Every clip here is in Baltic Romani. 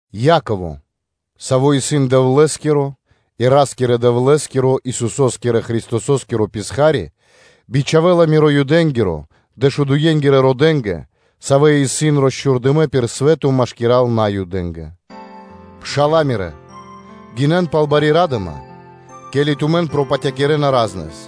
Яково, саво́ исын Дэвлэ́скиро и Ра́скирэ-Дэвлэ́скиро, Исусо́скирэ Христосо́скиро писха́ри (рабо), бичхавэ́ла миро (рама́нё) Юдэ́нгирэ дэшудуе́ родэ́нгэ, савэ́ исын росчхурдынэ пир свэ́то машкира́л Наюдэ́ндэ. Пшала́лэ мирэ́, гинэн пал бари ра́дыма, ке́ли тумэн пропатякирэна пир яви́р (разнэс),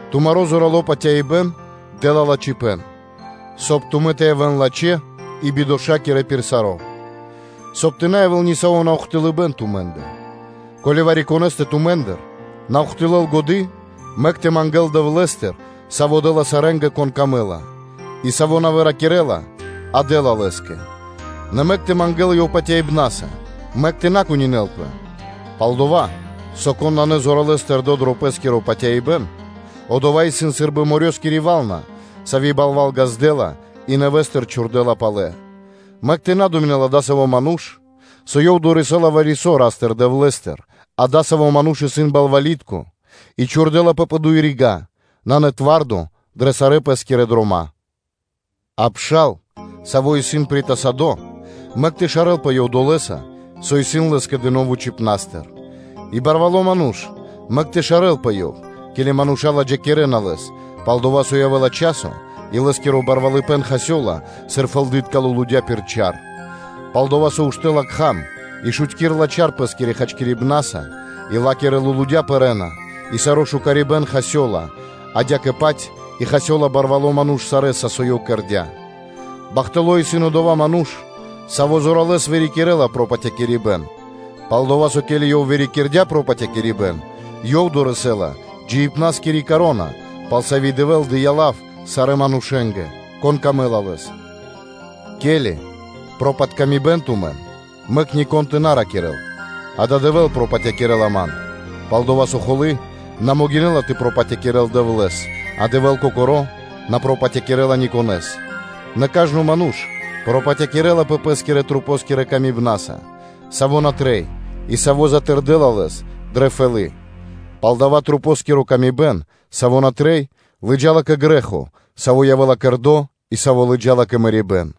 Тумаро зорало́ патяибэ́н тэ вырикирэл кэрэ́ла бидошакиро рэ́ндо (де́ло), соб (кай) тумэ́ тэ явэ́н лачхэ́ и бидошакирэ пир саро́, соб (кай) тэ на явэ́л ни саво́ наухтылыбэн тумэ́ндэ. Ко́ли вари-конэ́стэ тумэ́ндыр на ухтылэл (на́доси) годы́, то мэк ёв тэ мангэ́л Дэвлэ́стыр, Саво́ дэ́ла сарэ́нгэ, кон камэ́ла, и Саво́ на выракирэла, а дэ́ла лэ́скэ: нэ мэк ёв тэ мангэ́л патяибна́са; мэк ёв тэ на кунинэлапэ. Пал-дова́ со кон нанэ зоралэ́с тэрдо́ дро пэ́скиро патяибэ́н, одова́ исын сы́рбы морёскири вална (вэлна), сави́ балва́л ґаздэ́ла, и нэвэ́стыр чхурдэ́ла палэ: мэк тэ на думинэл адасаво́ ману́ш, со ёв дорэсэ́ла вари-со Ра́стыр-Дэвлэ́стыр; адасаво́ ману́ш исын балвалитко и чхурдэлапэ пэ дуй рига́, нанэ зорало́ пир ду́хо (фа́но) дрэ сарэ́ пэ́скирэ дрома́. А пшал, саво́ исын притасадо, мэк тэ шарэлпэ ёв долэса, со исын лэ́скэ дыно́ вучипна́стыр, и барвало́ ману́ш, мэк ёв тэ шарэлпэ, ке́ли мануша́ ладжакирэна лэс, пал-дова́ со явэ́ла часо и лэ́скиро барвалыпэ́н хасёла, сыр фэлды́тка лулудя́ (цвэты) пир чар. Пал-дова́ со уштэ́ла кхам и шутькирэла чар пэ́скирэ хачкирибнаса, и ла́кирэ лулудя́ (цвэты) пэрэ́на, и саро́ шукарибэн хасёла, адя́кэ-паць и хасёла барвало́ ману́ш сарэ́са, со ёв кэрдя́. Бахтало́ исын одова́ ману́ш, саво́ зоралэ́с вырикирэ́ла пропатякирибэн, пал-дова́ со, ко́ли ёв вырикирдя пропатякирибэн, ёв дорэсэ́ла джиибна́скири вя́нка, пал сави́ Дэвэ́л дыя́ лав сарэ́ манушэ́нгэ, конэ́скэ исын дро́го Ёв. Ке́ли пропатякирэна тумэн, мэк нико́н тэ на ракирэ́л: “Адава́ Дэвэ́л пропатякирэла ман”, пал-дова́ со холы́ на могинэ́ла тэ пропатякирэл Дэвлэ́с, а Дэвэ́л Кокоро́ на пропатякирэла никонэ́с. Нэ кажно ману́ш пропатякирэла пэс пэ́скирэ масэнгирэ тырдыпнаса, саво́ на трэй, и саво́ затырдэла лэс дрэ фэлы́; пало́ дава́ злыджаибэн, саво́ на трэй, и саво́ лыджа́ла кэ грэ́хо, саво́ явэ́ла кэрдо́ и саво́ лыджа́ла кэ мэрибэ́н.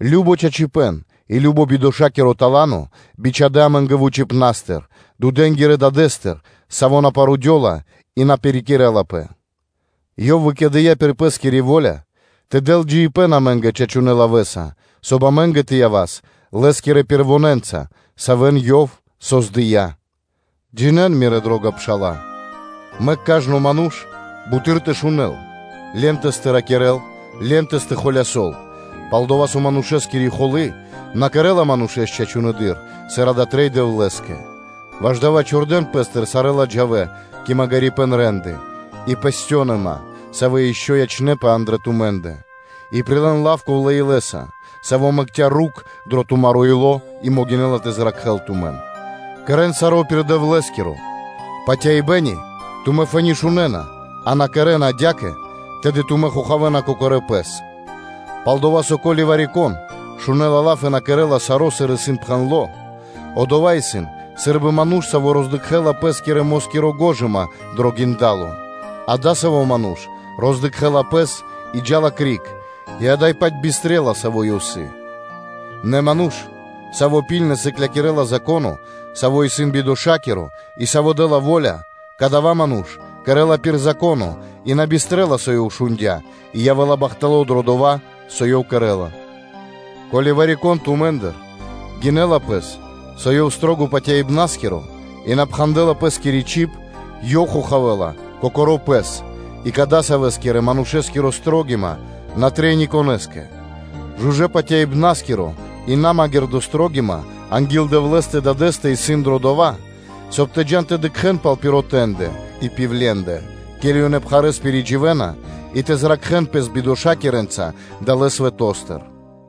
кажно лачхипэ́н и кажно бидошакиро тала́но бичхадэ́ амэ́нгэ вучипна́стыр, дудэнгирэ (свэтэнгирэ) Дадэ́стыр, Саво́ на парудёла, и на пирикэрэлапэ. Ёв выкэдыя́ пир Пэ́скири во́ля тэ дэл джиибэ́н амэ́нгэ чачунэ́ лавэ́са, соб (кай) амэ́нгэ тэ явас Лэ́скирэ пэрвонэнца, савэ́н Ёв создыя́. Джинэ́н, мирэ́ дро́га пшала́лэ: мэк кажно ману́ш буты́р тэ шунэ́л ле́нтэс/поволинькэс (насыгэс) тэ ракирэ́л, ле́нтэс тэ холясол. Пал-дова́ со манушэскири холы́ на кэрэ́ла манушэ́с чачунэдыр, сыр дава́ трэй Дэвлэ́скэ. Ваш дава́ отчхувэн пэ́стыр сарэ́ ладжавэ кэ магирипэ́н рэ́нды и песьцёныма, савэ́ ишчо (инкэ́) ячнэ́пэ андрэ́ тумэ́ндэ и прилэ́н лав ковлэ́ илэ́са, саво́ мэкця́ корнё (рукх) дро тумаро́ ило́ и могинэ́ла тэ зракхэ́л тумэн. Кэрэ́н саро́ пир Дэвлэ́скиро патяибэ́н, и, ко́ли тумэ́ фэ́ни шунэ́на, а на кэрэ́на адя́кэ, тэды тумэ́ хохавэна кокорэ́ пэс. Пал-дова́ со, ко́ли вари-кон шунэ́ла лав и на кэрэ́ла саро́, сыр исын пхэндло́, одова́ исын сы́рбы ману́ш, саво́ роздыкхэла пэ́скирэ-москири гожыма дро гиндало, а адасаво́ ману́ш роздыкхэла пэс и джа́ла криг и ада́й-паць бистрэла, саво́ ёв сыс. Нэ ману́ш, саво́ лачхэ́с сыклякирэ́ла Зако́но, саво́ исын бидошакиро, и саво́ дэ́ла во́ля; кадава́ ману́ш кэрэ́ла пир Зако́но, и на бистрэла, со ёв шундя́, и явэ́ла бахтало́ дро дова́, со ёв кэрэ́ла. Ко́ли вари-кон тумэ́ндыр гинэ́ла пэс, со ёв исын зорья́са патяибнаскиро, а на пхандэла пэ́скири чиб, ёв хохавэла кокоро́ пэс, и кадасавэскирэ-манушэскири строгима на трэй ни конэ́скэ. Жужэ́-патяибнаскири и намагирды строгима анги́л Дэвлэ́стэ Дадэ́стэ исын дро дова́, соб (кай) тумэ́ тэ джа́н тэ дыкхэ́н пал пиротэндэ (сиротэндэ) и пивлендэ (удовэндэ), ке́ли ёнэ пхарэ́с пиридживэна и тэ зракхэн пэс бидошакирэнца далэ́ свэто́стыр.